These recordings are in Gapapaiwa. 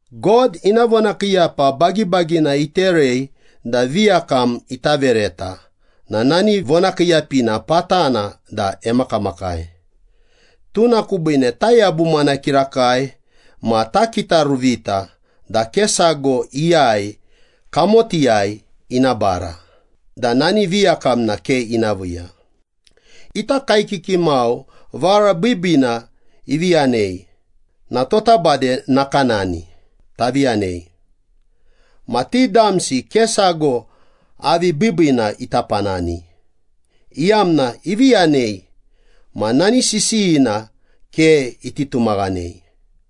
God ina vonakiiyapa bagibagina iterei da viyakam ita vereta na nani vonakiiyapina patana da emakamakai. Tuna kubiine tayabumana kirakai ma takitaruvita da ke sago iyai kamotiyai ina bara da nani viyakamna ke ina viiya. Ita kaekiki mau vara biibiina ivi yanei na tota bade nakanani, tavi yanei. Ma ti damsi ke sago avi biibiina ita panani, iyamna ivi yanei ma nani sisiyina ke iti tumaghanei.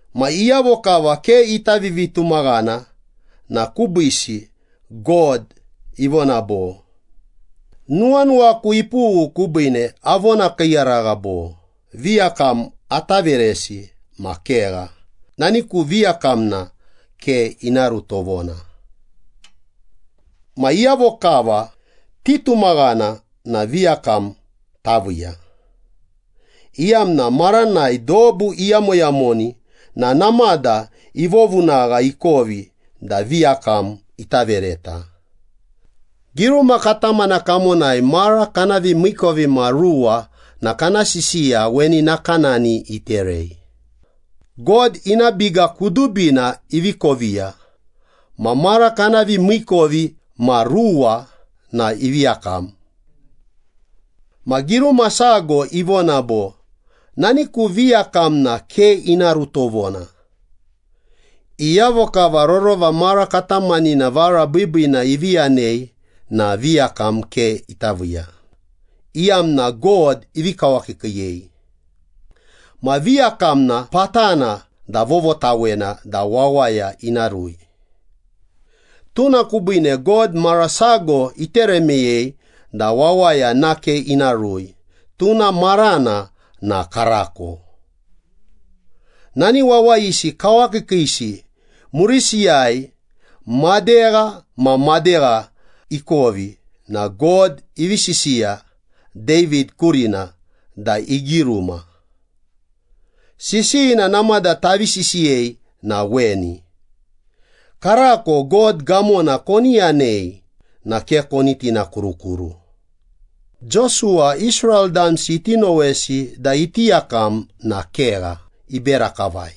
Ma iyavo kava ke ita vivitumaghana na kubiisi God ivona bo, “Nuwanuwaku ipughu kubiine avonakiiyaragha bo, ‘Viyakam ata veresi ma kegha, nani ku viyakamna ke ina ru tovona!’” Ma iyavo kava titumaghana na viyakam taviiya, iyamna maranai dobu iyamoyamoni na namada ivovunagha ikovi da viyakam ita vereta. Giruma katamana kamonai, mara kana vimiikovimasago na kana sisiya weni nakanani iterei, “God ina biga kudubina ivi koviya, ma mara kana vimiikovimasago na ivi yakam.” Ma giruma sago ivona bo, “Nani ku viyakamna ke ina ru tovona!” Iyavo kava rorova mara katamanina vara biibiina ivi yanei na viyakam ke ita viiya, iyamna God ivi kawakiikiiyei. Ma viyakam na patana da vovotawena da wawaya ina rui. Tuna kubiine God, mara sago itere meyei da wawaya nake ina rui, tuna marana na Karako. Nani wawayisi kawakiikiisi murisiyai madegha ma madegha ikovi na God ivi sisiya David kurina da igiruma. Sisiyina namada tavi sisiyei na weni, “Karako God gamona koni yanei, na ke koni tinakurukuru.” Josuwa Israel damsi iti nowesi da iti yakam na kegha, ibera kavai.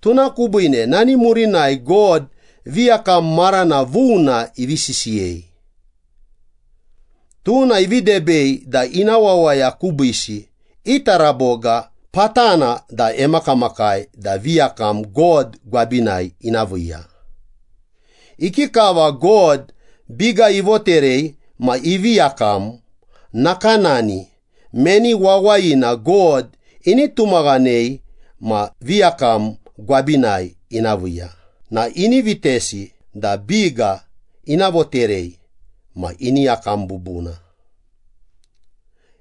Tuna kubiine nani murinai God viyakam marana vuna ivi sisiyei. Tuna ivi debei da ina wawaya kubiisi i taraboga patana da emakamakai da viyakam God gwabinai ina viiya. Ikikava God biga ivoterei ma ivi yakam, nakanani meni wawayina God ini tumaghanei ma viyakam gwabinai ina viiya na ini vitesi da biga ina voterei ma ini yakam bubuna.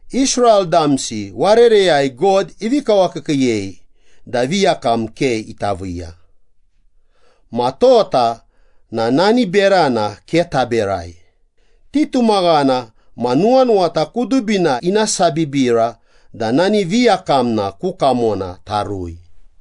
Israel damsi warereyai God ivi kawakiikiiyei da viyakam ke ita viiya. Ma tota na nani berana ke taberai, titumaghana ma nuwanuwata kudubina ina sabibira da nani viyakamna ku kamona tarui.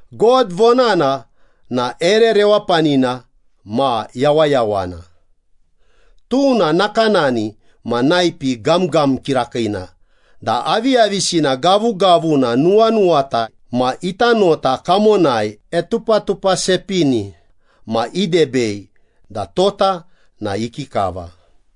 God vonana na ere rewapanina ma yawayawana. Tuna nakanani ma naipi gamgam kirakiina da aviyavisina gavugavuna nuwanuwata ma ita nota kamona etupatupasepini ma idebei da tota na ikikava.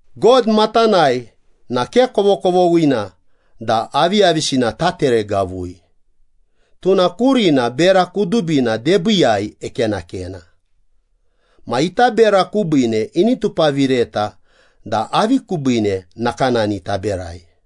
God matanai na ke kovokovoghina da aviyavisina tateregavui, tuna kurina bera kudubina debiiyai ekenakena. Ma ita bera kubiine ini tupavireta da avi kubiine nakanani taberai.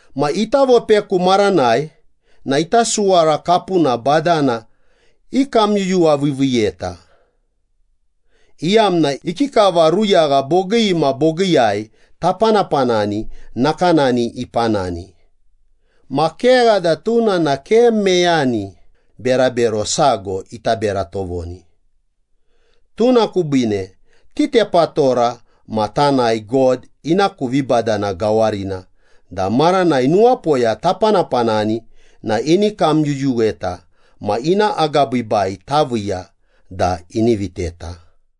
Ma ita vopeku maranai na ita suwara kapuna badana ikamyuyuwaviiviiyeta, iyamna ikikava ruyagha bogii ma bogiiyai tapanapanani nakanani ipanani, ma kegha da tuna na ke meyani berabero sago ita bera tovoni. Tuna kubiine titepatora ma tanae God ina ku vibadana gawarina da maranai nuwapoya tapanapanani na ini kamyuyuweta ma ina agabiibai taviiya da ini viteta.